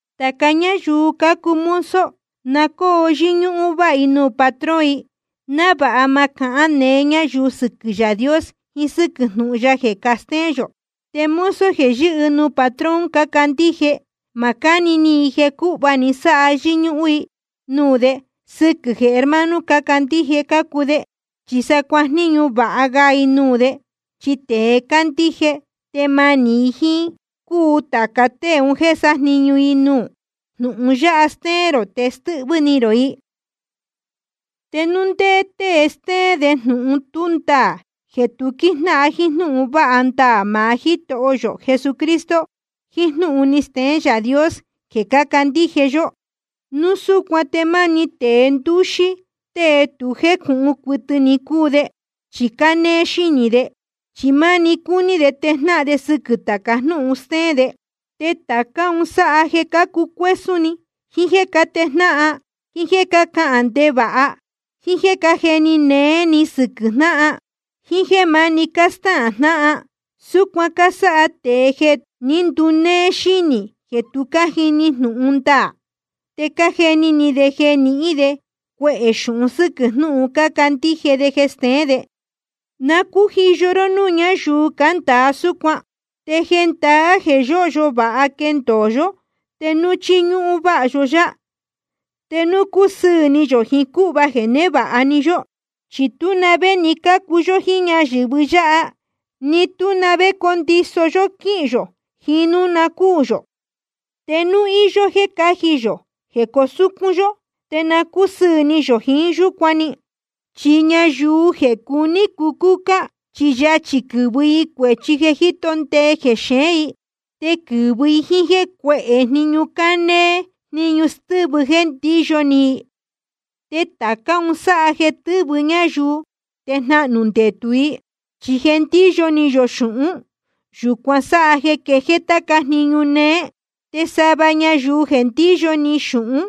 Tāca ñáyuu cácuu mozo, na cóo yɨ́ñúhún váha i nuū patrón i, návāha ma cahán neé ñayuu sɨquɨ̄ Yaā Dios jiín sɨ́quɨ̄ jnūhun ya jeē castéén yō. Te mozo jeē yɨ́hɨ nuū patrón cácandíje, ma cáni ni i jeē cūhva‑ni sáha yɨ́ñúhún i nuū de sɨquɨ̄ jeē hermano cácandíje cácuu de. Chi sa cuajníñu vāha ga i nuū de, chi tēe cándíje tēe manī i jíín cúu tāca tée un jéē sájniñu i nuū. Jnūhun yáha stéén rō te stɨ́hvɨ́ ni rō i. Te núu ndé tée stéén de jnūhun tú ndaā jeē tu quíjnáhan jíín jnúhun vāha ndaā maá Jítoho yō Jesucristo, jíín jnúhun ni steén Yaā Dios jeē cácandíje yó, núu súcuan te máni tēe ndúxí tée tu jécūhun cuɨtɨ ni cúu de. Chi cánéé xínī de, chi máni cúní de tejnáhan de sɨquɨ̄ tāca jnúhun stéén de. Te tācá un sáha jeē cácucuésún ni, jiín jéē cátejnáhan, jiín jéē cácahān ndevāha, jíín jéē cájeni néé ni sɨquɨ̄ jnáhan, jíín jéē máni cástáhān jnáhan. Súcuan cásáha tēe jeē ní ndunéé xínī, jeē tu cájini jnūhun ndaā. Te cájeni ni de jeē nihín de cuehē xūhun sɨ́quɨ̄ jnúhun cácandíje de stéén de. Na cújiyo ró núū ñáyuu cándāa súcuan. Te jendaá jeē yóhyo vāha quéndōo yó te núu chíñúhún váha yó yá, te núu cúsɨɨ̄ ni yō jiín cúhva jeē névāha‑ni yó. Chi tú na vé ni cácu yó jíín ñayɨ̄vɨ yáha, ni tú na vé condiso yó quíhīn yō jiín núu na cúū yō. Te núu íyó jéē cáji yō jeē cusúcún yó, te na cúsɨɨ̄ ni yō jiín yúcuan‑ni. Chi ñayuu jeē cuní cucúcá, chi yachī quɨ́vɨ i cuēchi jeē jíto ndee jexeén i. Te quɨ́vɨ i jíín cuéhē jniñu cánéé jniñu stɨ́vɨ jéē ndíyo ni i. Te tācá un sáha jeē tɨ́vɨ ñáyuu te jnahnū ndetū i. Chi jeē ndíyo ni yō xūhún, yūcuan sáha jeē quejéé táca jniñu néé. Te sava ñayuu jeē ndíyo ni xūhún,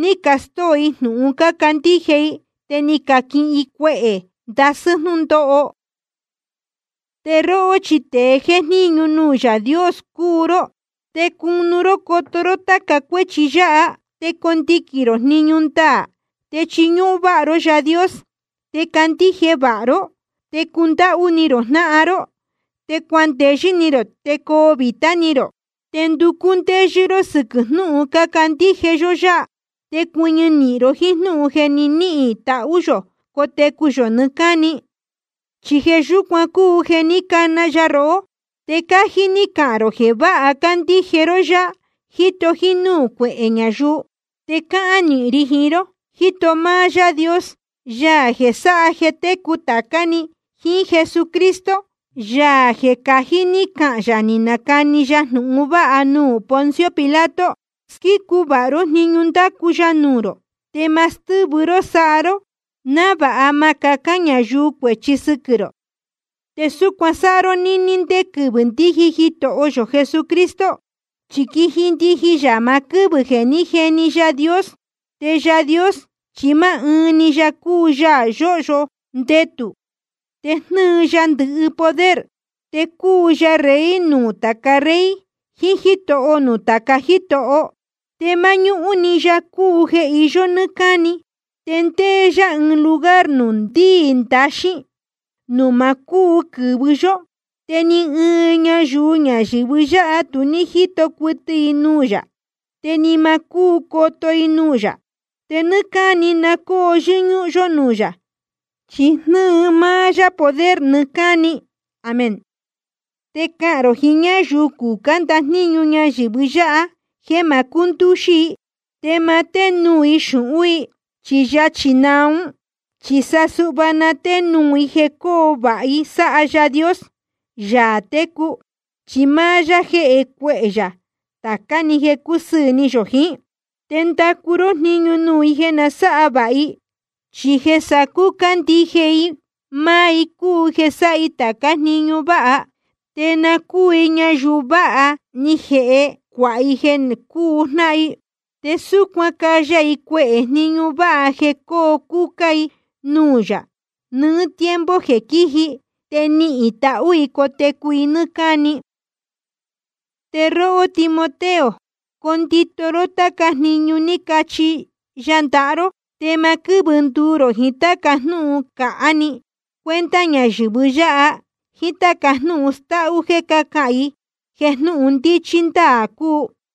ni castóo i jnūhun cácandíje i, te ni canihīn i cuehē ndasɨ́ jnúndóho. Te róhó chi tēe jéjníñu nuū Yaā Dios cúu ró, te cunu ró coto ró táca cuéchi yáha. Te condiquīn rō jniñu ndaā, te chiñúhún váha ró Yaā Dios, te candíje vāha ró, te cundáhú ni rō jnáhan ró, te cuandeyɨ́ ni rō, te coo vītá ni rō. Te nducú ndéyɨ́ ró sɨquɨ̄ jnúhun cándíje yó yá. Te cuɨñɨ nīhin ró jíín jnúhun jeē ni níhīn tahú yō cotecu yō nɨɨ́ cáni. Chi jeē yúcuan cúu jeē ní cana ya rohó, te cájí ní cahān rō jeē vāha cándíje ró yá, jíto jínúū cuehē ñayuu. Te cáhán nīhin ri jiín ró, jíto máá Yaā Dios, Yaā jeē sáha jeē técu tācá‑ni, jíín Jesucristo, Yaā jeē cají ní cahān yā ni nacani ya jnūhun vāha nuū Poncio Pilato. Squícu vāha ró jniñu ndácu ya nuū rō, te ma stɨ́vɨ ró sáha ró, návāha ma cahán ñayuu cuēchi sɨquɨ̄ rō. Te súcuan sáha ró nɨ́ɨ́ ndé quɨvɨ̄ ndíji Jitoho yō Jesucristo. Chi quiji ndijin yā maá quɨ́vɨ̄ jeē ní jeni Yaā Dios. Te Yaā Dios chi máá ɨɨn‑ni ya cúu Yaā yōhyo ndetū, te jnɨ́ɨ ya ndɨhɨ poder. Te cúu ya Rey nuū tāca rey, jiín Jítoho nuū tāca jítoho. Te máñúhún‑ni ya cúu jeē iyó nɨ́ɨ́ cáni. Te ndéé yá ɨɨn lugar nuū ndíī ndaxín, nuū ma cúu quɨ̄vɨ yó. Te ni ɨɨn ñayuu ñayɨ̄vɨ yáha tu ní jíto cuɨtɨ i nuū yā, te ni ma cúu coto i nuū yā. Te nɨ́ɨ́ cáni na cóo yɨ́ñúhún yó nuū yā, chi jnɨ́ɨ máá yá poder nɨɨ́ cáni. Amén. Te cahān rō jiín ñáyuu cucá ndajníñu ñayɨ̄vɨ yáha, jéē ma cúndúxí i. Te ma ténuū i xūhún i, chi yachī naa ún. Chi sa suhva na ténuū i jeē coo vāha i sáha Yaā Dios, Yaā técu, chi máá yá jéhe cuehē yā tācá‑ni jeē cúsɨɨ̄ ni yō jiín. Te ndacu ró jniñu nuū i jeē na sáha vāha i, chi jeē sacúcá ndije i máá i cúu jeē sáha i tācá jniñu váha. Te na cúu i ñayuu vāha ni jeē cuáha i jeē cúu jnáhan i. Te súcuan caya i cuehē jniñu váha jeē coo cúcá i nuū yā nɨɨ́ tiempo jeē quíji. Te nihīn tahú i cotecu i nɨ́ɨ́ cáni. Te róhó Timoteo, condito ró táca jniñu ní chihi ya ndaha ró. Te ma quɨ́vɨ nduu rō jiín táca jnúhun cāhá‑ni, cuenta ñayɨ̄vɨ yáha, jíín táca jnúhun stáhú jéē cácahān i jeē jnúhun ndíchí ndáā cúu.